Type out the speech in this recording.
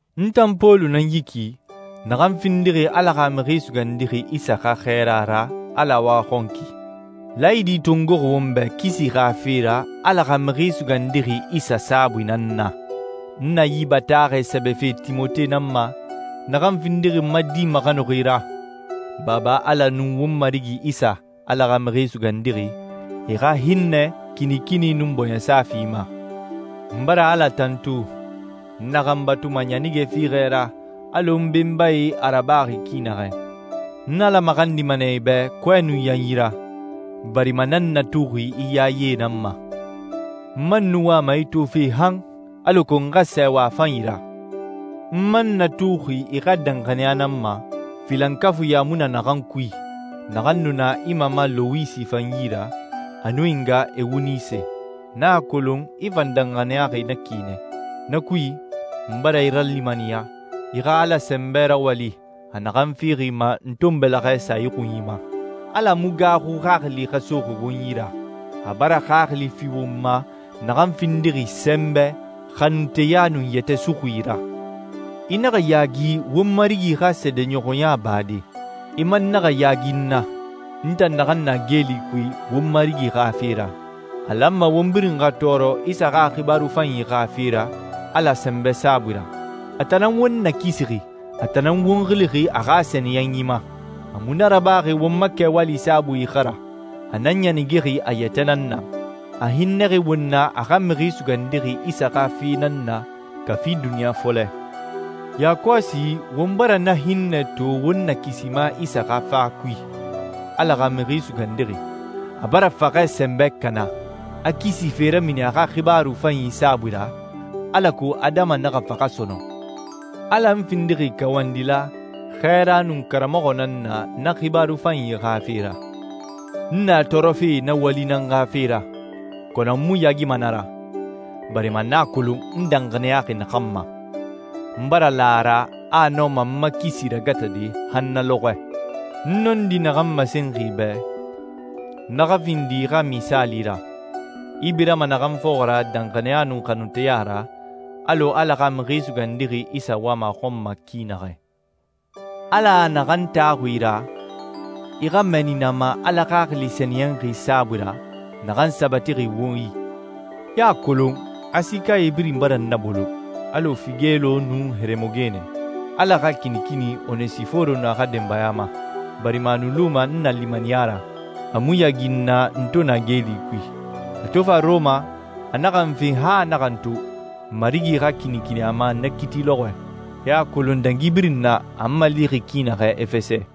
N tan Pɔlu nan yi ki, naxan findixi Ala xa Mixi Sugandixi Isa xa xɛɛra ra Ala waxɔnki. Laayidi tongoxi won bɛ kisi xa fe ra Ala xa Mixi Sugandixi Isa saabui nan na. N na yi bataaxɛ sɛbɛfe Timote nan ma, naxan findixi n ma di maxanuxi ra. Baba Ala nun won Marigi Isa, Ala xa Mixi Sugandixi, e xa hinnɛ, kinikini, nun bɔɲɛsa fi i ma. N bara Ala tantu, n naxan batuma ɲanige fiixɛ ra alɔ n benbae a rabaxi ki naxɛ. N Ala maxandima nɛ i bɛ kɔɛ nun yanyi ra, barima n nan n natuxi i yaye nan ma. N man nu wama i tofe han, alako n xa sɛɛwa a fanyi ra. N man n natuxi i xa danxaniya nan ma, filankafuiɲa mu na naxan kui, naxan nu na i mama Lowisi fan yi ra, a nun i nga Ewunise. N a kolon i fan danxaniyaxi na ki nɛ. Na kui, n bara i ralimaniya i xa Ala sɛnbɛ rawali, a naxan fixi i ma n to n bɛlɛxɛ sa i xunyi ma. Ala mu gaaxu xaxili xa soxi won yi ra. A bara xaxili fi won ma naxan findixi sɛnbɛ, xanunteya, nun yɛtɛ suxui ra. I naxa yaagi won Marigi xa seedeɲɔxɔya bade. I man naxa yaagi n na, n tan naxan na geeli kui won Marigi xa fe ra. A lanma won birin xa tɔɔrɔ Isa xa xibaaru fanyi xa fe ra Ala sɛnbɛ saabui ra. A tan nan won nakisixi, a tan nan won xilixi a xa sɛniyɛnyi ma. A mu na rabaxi won ma kɛwali saabui xa ra, a na ɲanigexi a yɛtɛ nan na. A hinnɛxi won na a xa Mixi Sugandixi Isa xa fe nan na kafi duniɲa fɔlɛ. Yakɔsi won bara na hinnɛ to won Nakisima Isa xa fa kui, Ala xa Mixi Sugandixi. A bara faxɛ sɛnbɛ kana, a kisi fe ramini a xa xibaaru fanyi saabui ra, alako adama naxa faxa sɔnɔn. Ala n findixi kawandila, xɛɛra, nun karamɔxɔ nan na na xibaaru fanyi xa fe ra. N na tɔɔrɔfe na wali nan xa fe ra, kɔnɔ n mu yaagima na ra, barima n a kolon n danxaniyaxi naxan ma. N bara la a ra a nɔma n ma kisi ragatade han na lɔxɔɛ. N nɔndi naxan masenxi i bɛ, na xa findi i xa misaali ra, i birama naxan fɔxɔ ra danxaniya nun xanunteya ra, alɔ Ala xa Mixi Sugandixi Isa wama a xɔn ma ki naxɛ. Ala naxan taxuxi i ra, i xa mɛɛni na ma Ala Xaxili Sɛniyɛnxi saabui ra, naxan sabatixi won i. I a kolon Asikae birin bara n nabolo, alɔ Figelo nun Heremogene. Ala xa kinikini Onesiforo nun a xa denbaya ma, barima a nu luma n nalimaniya ra. A mu yaagi n na n to na geeli kui. A to fa Rɔma, a naxa n fen han a naxa n to. Marigi xa kinikini a ma na kiiti lɔxɔɛ. I a kolon dangi birin na a n malixi ki naxɛ Efɛsɛ.